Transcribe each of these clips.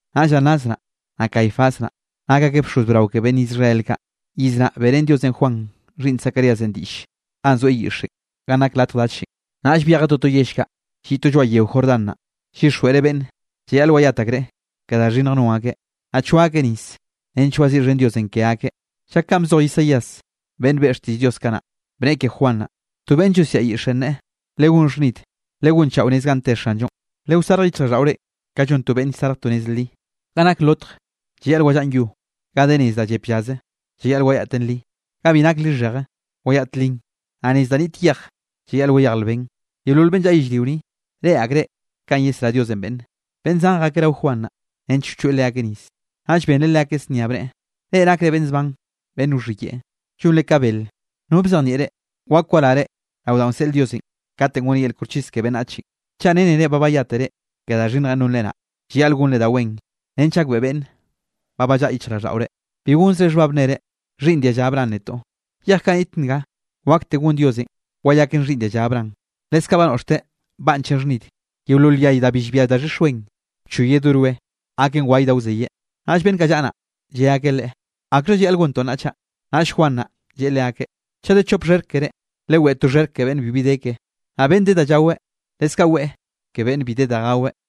Naꞌll Anás naꞌ, naꞌ Caifás naꞌ, nak akeꞌ bxoz brao ke beꞌnn Israel kaꞌ. Iz naꞌ, beꞌrén Diosenꞌ Juan xhiꞌnn Zacaríasenꞌ diꞌlle ganꞌ zoeꞌ yiꞌxenꞌ, ganꞌ nak latj dachenꞌ. Naꞌll byejeꞌ toto yell kaꞌ lliꞌ to lloaꞌ yeo Jordán naꞌ, llyixjweꞌreꞌ beꞌnne llayaꞌl wayat akreꞌ ke da xhinnj non akeꞌ, naꞌ choa akeꞌ nis nench waziꞌxhen Diosenꞌ ke akeꞌ. Llak kanꞌ bzoj Isaías beꞌnn beꞌe xtiꞌll Diosenꞌ kanaꞌ, bneꞌe ke Juan naꞌ: To beꞌnn llosiaꞌ lyiꞌxenꞌ neꞌe: “Legón xhnid, legonchaꞌo nez ganꞌ te Xanllonꞌ, lewsarj yichjraꞌlldaꞌore ka llon to beꞌnn llsarj to nez li. Ga nak lotj, llayaꞌl wallaꞌn yo, ga de nez da llep llaze, llayaꞌl wayaꞌten li. Ga bi nak lixheje, wayaꞌt linꞌ, naꞌ nez da niꞌt yej, llayaꞌl wayej lben. Yeolol beꞌnn llaꞌa yellrio ni, reꞌe akreꞌ kanꞌ yesrá Diosenꞌ beꞌnne.” Beꞌnn zan jakeꞌ rao Juan naꞌ, nench wchoeꞌ leakeꞌ nis, naꞌll benreꞌ leakeꞌ znia bneꞌe: —¡Reꞌ nakre beꞌnn zban beꞌnn wxhiyeꞌe, llonre ka bele! ¿No bzejnieꞌ reꞌ, wak warare rao danꞌ wseꞌl Diosenꞌ katenꞌ goneꞌ yel koxchis ke beꞌnnachenꞌ? Chaꞌ rennere ba bayátere ke da xhinnjenꞌ nonre naꞌ, llayaꞌl gonre da wen nench gakbeꞌe beꞌnne ba ballaꞌa yichjraꞌlldaꞌore. Bi gonzre xhbab nnere: “Xhiꞌnn dia lla Abraham netoꞌ.” Yej kaꞌ niꞌt nga, wakte gon Diosenꞌ wayaken xhiꞌnn dialla Abraham. Leskaꞌ ba noꞌxteꞌ banchenꞌ xhnid, yeolol yay da bi llbia daxhix wen, wchoyeꞌ do roe, gaken waye da wzeyeꞌ. Naꞌll beꞌnn kaꞌ llaꞌa naꞌ, lle akeꞌ leꞌe: —¿Akxha llayaꞌl gontoꞌ nnaꞌ chaꞌ? Naꞌll Juan naꞌ, lleꞌe leakeꞌ: —Chaꞌ de chop xherk kere, leweꞌe to xherk ke beꞌnn bibi de keꞌe. Naꞌ beꞌnn de da llaweꞌ, leskaꞌ weꞌe ke beꞌnn bi de da gaweꞌ.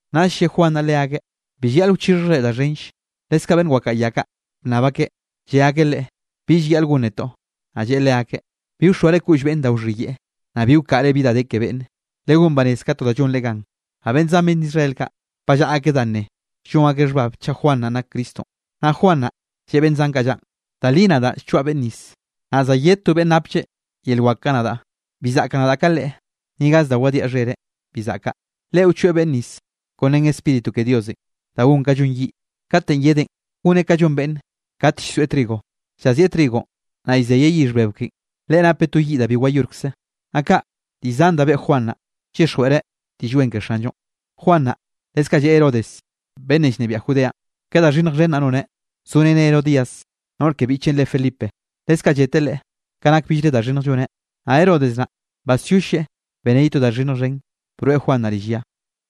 Naꞌll lle Juan naꞌ leakeꞌ: —Bi llayaꞌl wchixhjre da xhenll. Leskaꞌ beꞌnn wakaꞌa ya kaꞌ bnnab akeꞌ, lle akeꞌ Leꞌe: —¿Bi llayaꞌl gon netoꞌ? Naꞌ lleꞌe leakeꞌ: —Bi wxoare koꞌll beꞌnne da wxhiyeꞌe, naꞌ bi wkaꞌre bi da de ke beꞌnne. Legón banez ka to da llonre gan. Naꞌ beꞌnn zan beꞌnn Israel kaꞌ, ba llaꞌa akeꞌ dá nne, llon akeꞌ xhbab chaꞌ Juan naꞌ nak Cristonꞌ. Naꞌll Juan naꞌ, lleꞌe beꞌnn zan kaꞌ llaꞌn: —Da li nadaꞌ llchoaꞌ beꞌnn nis, naꞌ za yed to beꞌnn naplle yel wak ka nadaꞌ, bi zaꞌkaꞌ nadaꞌ ka Leꞌe, ni gaz da wadiaꞌ xhereꞌ bi zaꞌkaꞌ. Leꞌe wchoeꞌ beꞌnn nis kon ren Spíritu ke Diosenꞌ, da gon ka llon yiꞌ. Katenꞌ yedeꞌn, goneꞌ ka llon beꞌnn kate llsoeꞌ trigo, llazieꞌ trigonꞌ, naꞌ llzeyeꞌ yixh bebe ken. Leꞌe napeꞌ to yiꞌ da bi wayorkze. Naꞌ kaꞌ, diꞌll zan da beꞌe Juan naꞌ, llyixjweꞌreꞌ Diꞌll Wen ke Xanllonꞌ. Juan naꞌ, leskaꞌ lleꞌe Herodes beꞌnnenꞌ llnebiaꞌ Judeanꞌ, ka da xhinnj xhen naꞌ noneꞌ, zoreneꞌ Herodías noꞌr ke biꞌcheꞌn re Felipe. Leskaꞌ lleteꞌ leꞌe ka nak billre da xhinnj lloneꞌ. Naꞌ Herodes naꞌ, basyolleꞌ beneꞌ ye to da xhinnj xhen, broeꞌ Juan naꞌ rill ya.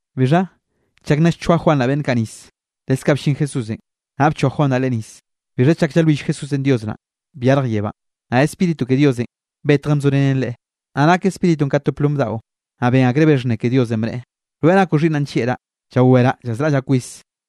Bixha chak nna llchoa Juan naꞌ beꞌnn kaꞌ nis, leskaꞌ bllin Jesúsenꞌ, naꞌ bchoa Juan naꞌ Leꞌe nis. Bixha chak llalwill Jesúsenꞌ Dios naꞌn, byarj yebánꞌ, naꞌ Spíritu ke Diosenꞌ betjen bzorenen Leꞌe, naꞌ nak Spíritunꞌ ka to plom daꞌo, naꞌ ben akreꞌ be xhnne ke Diosenꞌ bneꞌe: —Rweꞌ nakoꞌ xhiꞌnnaꞌ nllieꞌraꞌ, llaweraꞌ llazraꞌllaꞌ kwis.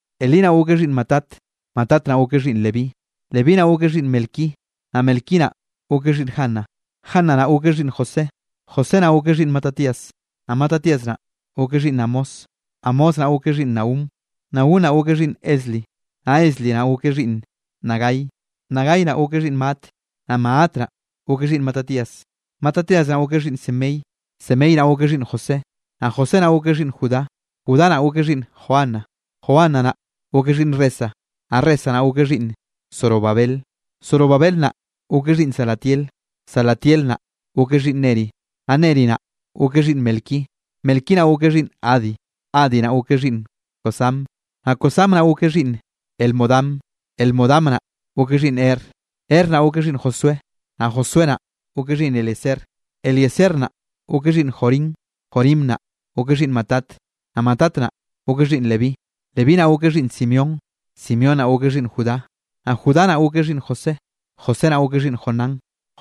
Elí naꞌ gokeꞌ xhiꞌnn Matat, Matat naꞌ gokeꞌ xhiꞌnn Leví, Levínꞌ naꞌ gokeꞌ xhiꞌnn Melqui, naꞌ Melqui naꞌ gokeꞌ xhiꞌnn Jana, Jana naꞌ gokeꞌ xhiꞌnn José. José naꞌ gokeꞌ xhiꞌnn Matatías, naꞌ Matatías naꞌ gokeꞌ xhiꞌnn Amós, Amós naꞌ gokeꞌ xhiꞌnn Nahum, Nahum naꞌ gokeꞌ xhiꞌnn Esli, naꞌ Esli naꞌ gokeꞌ xhiꞌnn Nagai, Nagai naꞌ gokeꞌ xhiꞌnn Maat, naꞌ Maat naꞌ gokeꞌ xhiꞌnn Matatías, Matatías naꞌ gokeꞌ xhiꞌnn Semei, Semei naꞌ gokeꞌ xhiꞌnn José, naꞌ José naꞌ gokeꞌ xhiꞌnn Judá. Judá naꞌ gokeꞌ xhiꞌnn Joana, Joana naꞌ gokeꞌ xhiꞌnn Resa, naꞌ Resa naꞌ gokeꞌ xhiꞌnn Zorobabel, Zorobabel naꞌ gokeꞌ xhiꞌnn Salatiel, Salatiel naꞌ gokeꞌ xhiꞌnn Neri. Naꞌ Neri naꞌ gokeꞌ xhiꞌnn Melqui, Melqui naꞌ gokeꞌ xhiꞌnn Adi, Adi naꞌ gokeꞌ xhiꞌnn Cosam, naꞌ Cosam naꞌ gokeꞌ xhiꞌnn Elmodam, Elmodam naꞌ gokeꞌ xhiꞌnn Er. Er naꞌ gokeꞌ xhiꞌnn Josué, naꞌ Josué naꞌ gokeꞌ xhiꞌnn Eliezer, Eliezer naꞌ gokeꞌ xhiꞌnn Jorim, Jorim naꞌ gokeꞌ xhiꞌnn Matat. Naꞌ Matat naꞌ gokeꞌ xhiꞌnn Leví, Leví naꞌ gokeꞌ xhiꞌnn Simeón, Simeón naꞌ gokeꞌ xhiꞌnn Judá, naꞌ Judá naꞌ gokeꞌ xhiꞌnn José, José naꞌ gokeꞌ xhiꞌnn Jonán,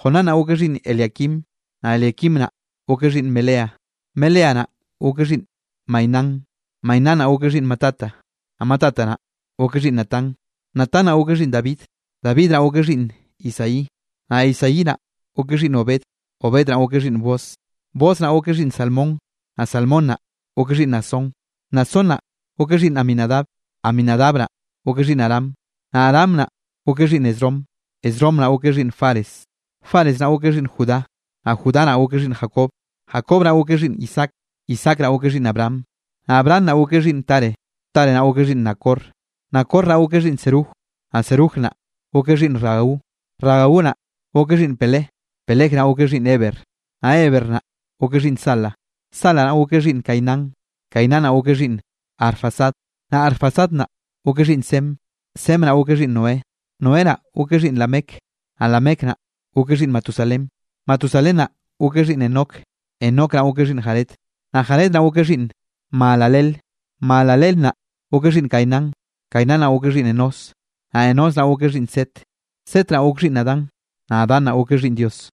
Jonán naꞌ gokeꞌ xhiꞌnn Eliaquim. Naꞌ Eliaquim naꞌ gokeꞌ xhiꞌnn Melea, Melea naꞌ gokeꞌ xhiꞌnn Mainán, Mainán naꞌ gokeꞌ xhiꞌnn Matata, naꞌ Matata naꞌ gokeꞌ xhiꞌnn Natán. Natán naꞌ gokeꞌ xhiꞌnn David, David naꞌ gokeꞌ xhiꞌnn Isaí, naꞌ Isaí naꞌ gokeꞌ xhiꞌnn Obed, Obed naꞌ gokeꞌ xhiꞌnn Booz, Booz naꞌ gokeꞌ xhiꞌnn Salmón, naꞌ Salmón naꞌ gokeꞌ xhiꞌnn Naasón. Naasón naꞌ gokeꞌ xhiꞌnn Aminadab, Aminadab nanꞌ gokeꞌ xhiꞌnn Aram, naꞌ Aram naꞌ gokeꞌ xhiꞌnn Esrom, Esrom naꞌ gokeꞌ xhiꞌnn Fares, Fares naꞌ gokeꞌ xhiꞌnn Judá. Naꞌ Judá naꞌ gokeꞌ xhiꞌnn Jacob, Jacob naꞌ gokeꞌ xhiꞌnn Isaac, Isaac naꞌ gokeꞌ xhiꞌnn Abraham, naꞌ Abraham naꞌ gokeꞌ xhiꞌnn Taré, Taré naꞌ gokeꞌ xhiꞌnn Nacor. Nacor naꞌ gokeꞌ xhiꞌnn Serug, naꞌ Serug naꞌ gokeꞌ xhiꞌnn Ragau, Ragau naꞌ gokeꞌ xhiꞌnn Peleg, Peleg naꞌ gokeꞌ xhiꞌnn Heber, naꞌ Heber naꞌ gokeꞌ xhiꞌnn Sala. Sala naꞌ gokeꞌ xhiꞌnn Cainán, Cainán naꞌ gokeꞌ xhiꞌnn Arfaxad, naꞌ Arfaxad naꞌ gokeꞌ xhiꞌnn Sem, Sem naꞌ gokeꞌ xhiꞌnn Noé, Noé naꞌ gokeꞌ xhiꞌnn Lamec. Naꞌ Lamec naꞌ gokeꞌ xhiꞌnn Matusalén, Matusalén naꞌ gokeꞌ xhiꞌnn Enoc, Enoc naꞌ gokeꞌ xhiꞌnn Jared, naꞌ Jared naꞌ gokeꞌ xhiꞌnn Mahalaleel, Mahalaleel naꞌ gokeꞌ xhiꞌnn Cainán. Cainán naꞌ gokeꞌ xhiꞌnn Enós, naꞌ Enós naꞌ gokeꞌ xhiꞌnn Set, Set naꞌ gokeꞌ xhiꞌnn Adán, naꞌ Adán naꞌ gokeꞌ xhiꞌnn Dios.